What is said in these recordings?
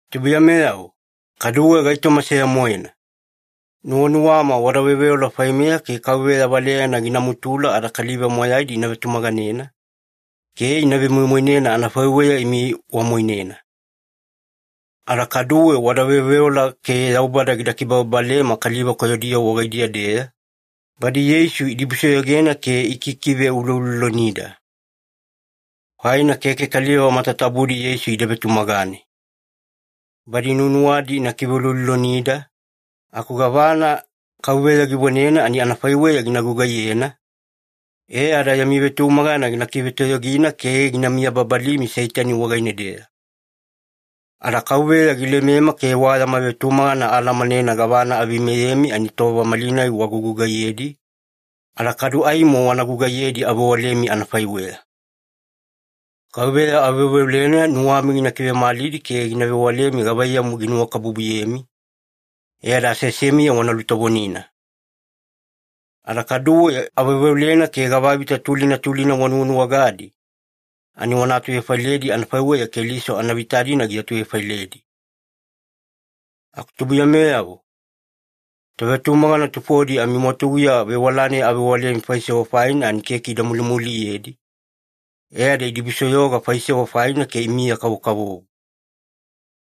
Tubuiyameyavo, kaduwe gaitoma seya-moena. Nuwanuwama wada veoveola faimeya ke Kauveya valeyana gina mutula ada kaliva moyaidi ina vetumaganena, ke ina vemoimoinena anafaiweya imi wamoinena. Ada kaduwe wada veoveola ke Yaubada gida kibababalema kaliva koyodiyavo wagaidiya-deya, badi Yeisu idibusoyogena ke ikikiveuloulolonida. Faina keke kaliva matatabudi Yeisu ida vetumagane. Badi nuwanuwadi ina kiveuloulolonida, aku gavana Kauveya givonena ani anafaiweya gina gugaiyena, e ada yami vetumagana gina kivetoyogina ke gina miyababalimi Seitani wagaine-deya. Ada Kauveya gilemema ke wa yama vetumagana aalamanena gavana aveimeyemi ani tova malinai wagugugaiyedi, ada kadu aimo wana gugaiyedi avewalemi anafaiweya. Kauveya aveoveolena nuwami gina kivemalidi ke gina vewalemi gavaiyamu ginuwakabubuyemi, e ada aseasemiya wana lutovonina. Ada kaduwe aveoveolena ke gavavita tulina tulina wanuwanuwagadi, ani wana atuvefailedi anafaiweya Keliso anavita-dina giatuvefailedi. Aku tubuiyameyavo, tovetumagana tufodi amimwatuguya vewala-nai avewalemi faisewa faina ani keke ida mulimuliyedi, e ada idibusoyoga faisewa faina ke imiya-kavokavovo.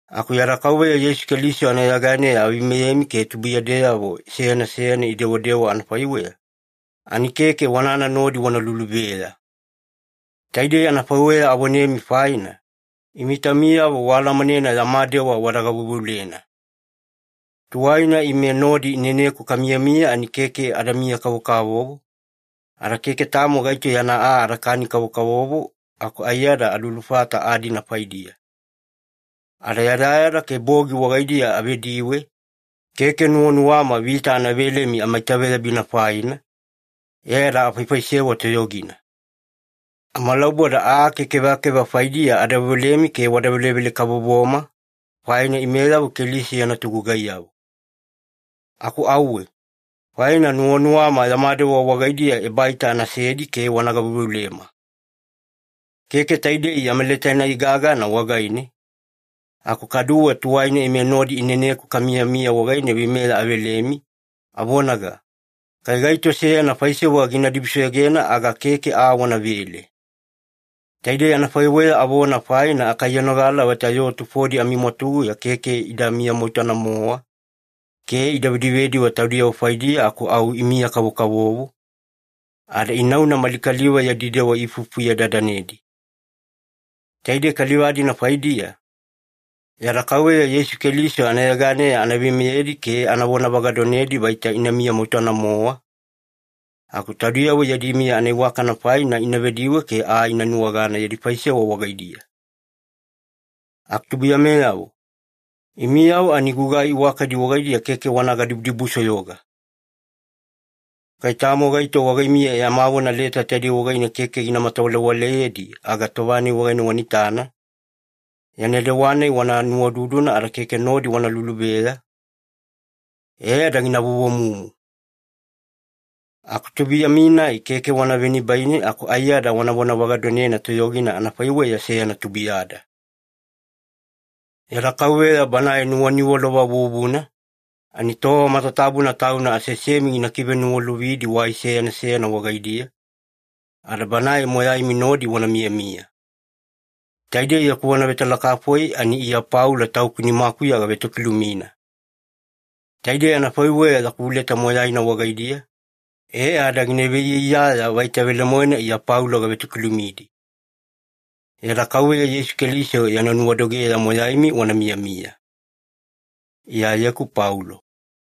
Aku yada Kauveya Yeisu Keliso anayeganeya aveimeyemi ke tubuiyadeyavo seyana seyana idewadewa anafaiweya, ani keke wanana nodi wana luluveya. Taidei anafaiweya avonemi, faina imi taumiyavo waalamanena yama dewa wada gaveuveulena. Tuwaina ime nodi ineneku kamiyamiya ani keke adamiya-kavokavovo, ada keke tamo gaito yana aa adakani-kavovo aku aiyada alulufata aa-dina faidiya. Ada yadayada ke bogi wagaidiya avediwe, keke nuwanuwama vita ana velemi amaitaveyabina faina, e ada afaifaisewa toyogina. Amalauboda aa ke kevakeva faidiya ada veolemi ke wada velevele-kavovoma, faina imeyavo Keliso yana togugaiyavo. Aku auwe, faina nuwanuwama yama dewa wagaidiya ebaita anasedi ke wana gaveuveulema. Keke taidei yama leta-nai gagana wagaine, aku kaduwe tuwaina ime nodi ineneku kamiyamiya wagaine veimeya avelemi, avonaga, “Kai gaito seyana faisewa gina dibusoyogena aga keke aa wanavele.” Taidei anafaiweya avona faina akaiyanogala vaita yoo tufodi amimwatuguya keke ida miyamoutana-mowa, ke ida vedivediwe taudiyavo faidiya aku au imiya-kavokavovo, ada inauna mali kaliva yadi dewa iifuifufuye-dadanedi. Taidei kaliva-dina faidiya, yada Kauveya Yeisu Keliso anayeganeya ana veimeyedi ke ana vonavagadonedi vaita ina miyamoutana-mowa, aku taudiyavo yadi miya anaiwakana faina ina vediwe ke aa ina nuwagana yadi faisewa wagaidiya. Aku tubuiyameyavo, imiyavo ani gugai iwakadi wagaidiya keke wana gadibudibusoyoga. Kai tamo gaito wagaimiya yama vona leta taidei wagaine keke gina matawalewaleyedi aga tova-nai wana itana, yana dewa-nai wana nuwaududuna ada keke nodi wana luluveya, e ada gina vovomumu. Aku tubuiyami-nai keke wana venibaine aku aiyada wana vonavagadonena toyogina anafaiweya seyana tubuiyada. Yada Kauveya Banae nuwaniwalova vuvuna, ani tova matatabuna Tauna aseasemi gina kiveniwalovidi wai seyana seyana wagaidiya, ada Banae moyaimi nodi wana miyamiya. Taidei yaku vona vetalakafoi ani Iya Paulo tauku nimakuya gavetokilumina. Taidei anafaiweya yaku leta moyaina wagaidiya, e ada gina veiyaiyaya vaita velemoena Iya Paulo gavetokilumidi. Yada Kauveya Yeisu Keliso yana nuwadogeya moyaimi wana miyamiya. Iyayeku Paulo